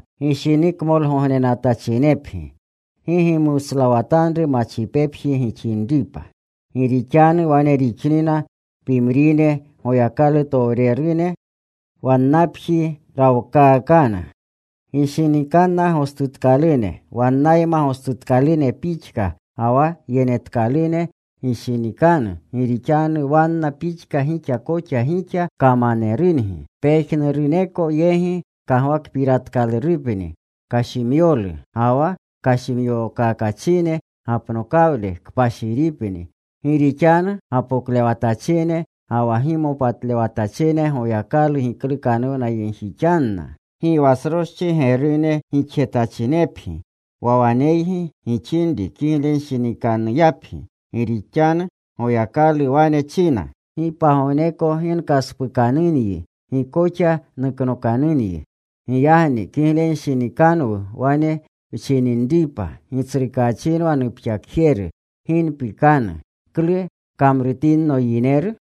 Gishinikmolkakgognenatachinepgi. Gi gimuslawatanru machipepjigi gixinripa. Gi rixanu wane rixinna pimrine, Goyakalutowrerune wannapji rawkaakana. Gishinikanna gostutkalune wannayma gostutkalunepgi pixka, ga wa yenetkalune gishinikanu gi rixanu wanna pixka gixa koxa gixa kamanerungi. Pejnuruneko yegi kagwakpiratkalurupni kashimyokaklu. Ga wa kashimyokakachine gapnokawle kpashiripni. Gi rixanu gapoklewatachine ga wa gimopatlewatachine Goyakalu giklukanuwnayegjixanna. Gi wa sroschi gerune gixjetachinepgi. Wa waneygi gixinri kiglenshinikanuyapgi. Gi rixanu Goyakalu wane china: “Gi pagogneko gi nkaspukanunyi. Gi koxa nuknokanyi.” Giyagni kiglenshinikanwu wane wchininripa: “Gitsrukaachinwa nupxakjeru. Gi npikanu. ¿Klu kamrutinno yineru?”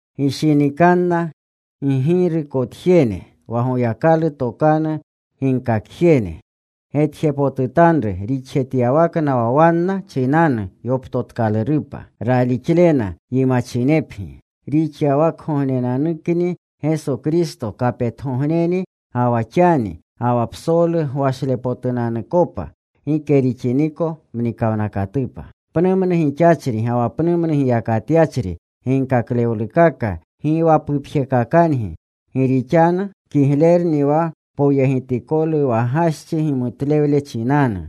Gishinikanna ggirukotjene, wa Goyakalu tokanu ginkakjene. Getjepotutanru rixjetyawakna wa wanna chinanu yoptotkalurupa. Ralixlena yimachinepgi. Rixyawakgognenanukni Geso Kristo kapetgogneni ga wa xani, ga wa psolu gwashlepotunanukopa gike rixiniko mnikawnakatupa. Pnumnu gixachri ga wa pnu giyakatyachri ginkaklewlukaka gi wa pupjekakangi. Gi rixanu kiglerni wa poyegitikolu wa gaschi gimutlewlu chinanu,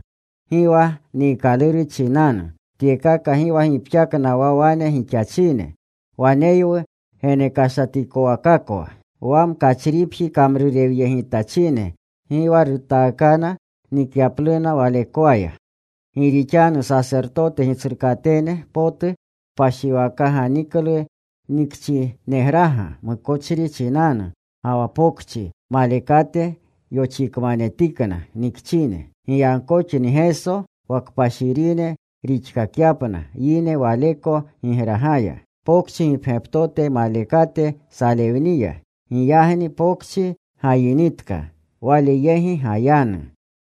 gi wa niikaluru chinanu. Tyekaka gi wa gipxakna wa wane gixachine. Waneywu genekashatikowakakwa. Wa mkachripji kamrurewyegitachine gi wa rutaakana nikyapluna walekwaya. Gi rixanu sasertote gitsrukatene potu kpashiwaka ganiklu nikchinegraga mukochri chinanu. Ga wa pokchi malekate yoxikmanetikna nikchine. Giyagkoxni Geso, wa kpashirine rixkakyapna yine Waleko gigragaya, pokchi gipgyaptote malekate salewniya. Giyagni pokchi gayinitka. Wale yegi gayanu.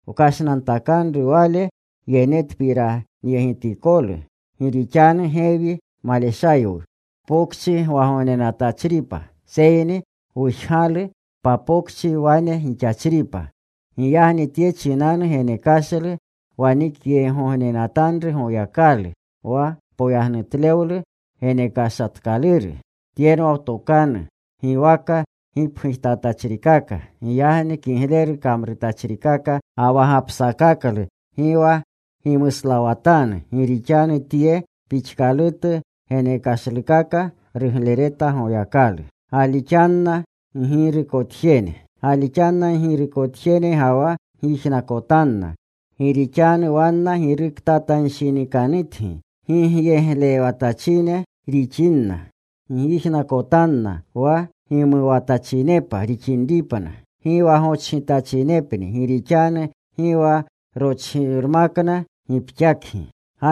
Wkashnantakanru Wale yenetpiranyegitikolu. Gi rixanu gewi maleshaywu pokchi gwagognenatachripa. Seyni wujgalu papokchi wane gixachripa. Giyagni tye chinanu genekashlu wanikyegjegognenatanru Goyakalu, wa poyagnutlewlu genekashatkaluru. Tyenwa wtokanu, giwaka gipgujtatachrikaka. Giyagni kigleru kamrurchikaka ga wa gapsakaklu gi wa gimuslawatanu. Gi rixanu tye pixkalutu genekashlukaka ruglereta Goyakalu. Galixanna ggirukotjene ga wa gyijnakotanna. Gi rixanu wanna giruktatanshinikanutgi gigyeglewatachine rixinna. Gyijnakotanna wa gimuwatachinepa rixinripna, gi wa gochgitachinepni, gi rixanu gi wa rochgirmakna gipxakgi.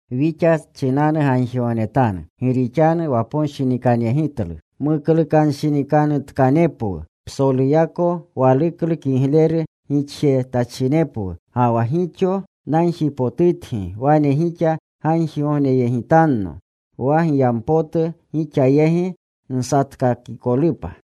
Wixa chinanu gagjigognetanu. Gi rixanu waponshinikanyegitlu muklukanuwnanshinikanutkanepwu. Psoluyako waluklu kigleru gixjetachinepwu. Ga wa gixo nagjipotutgi wane gixa gagjigogneyegitanno, wa giyampotu gixa yegi nsatkakikolupa.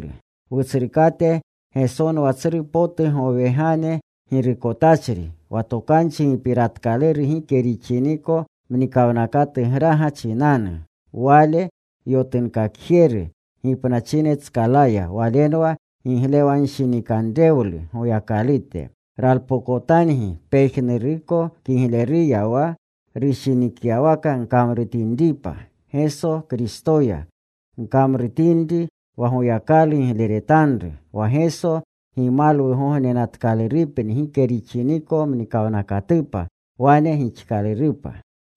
Wutsrukate Gesonwa tsru potu gowegane girukotachri, wa tokanchi gipiratkaluru gike rixiniko mnikawnakatugraga chinanu. Wale yotunkakjeru gipnachinetskalaya Walenwa giglewanshinikanrewlu Goyakalute. Ralpokotangi pejnuruko kigleruya wa rushinikyawaka gkamrutinripa, Geso Kristoya gkamrutinri wa Goyakalu gigleretanru, wa Geso gimalwugognenatkalurupni gike rixiniko mnikawnakatupa. Wane gixkalurupa.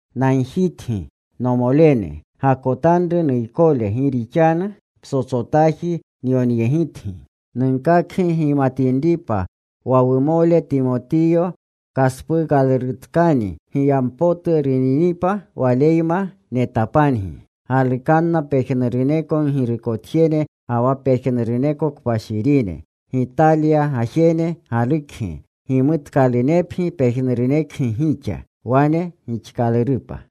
Nagjitgi, nomolene, gakotanru nuykole, gi rixanu psotsotaji nyonyegitgi. Nunkakgi gimatinripa wa wumole Timotiyo kaspuukalurutkani. Giyampotu runinipa, waleyma netapangi. Galukanna pejnuruneko ggirukotjene ga wa pejnuruneko kpashirine. Gitalya gajene galukgi. Gimutkalunepgi pejnurunekgi gixa. Wane gixkalurupa.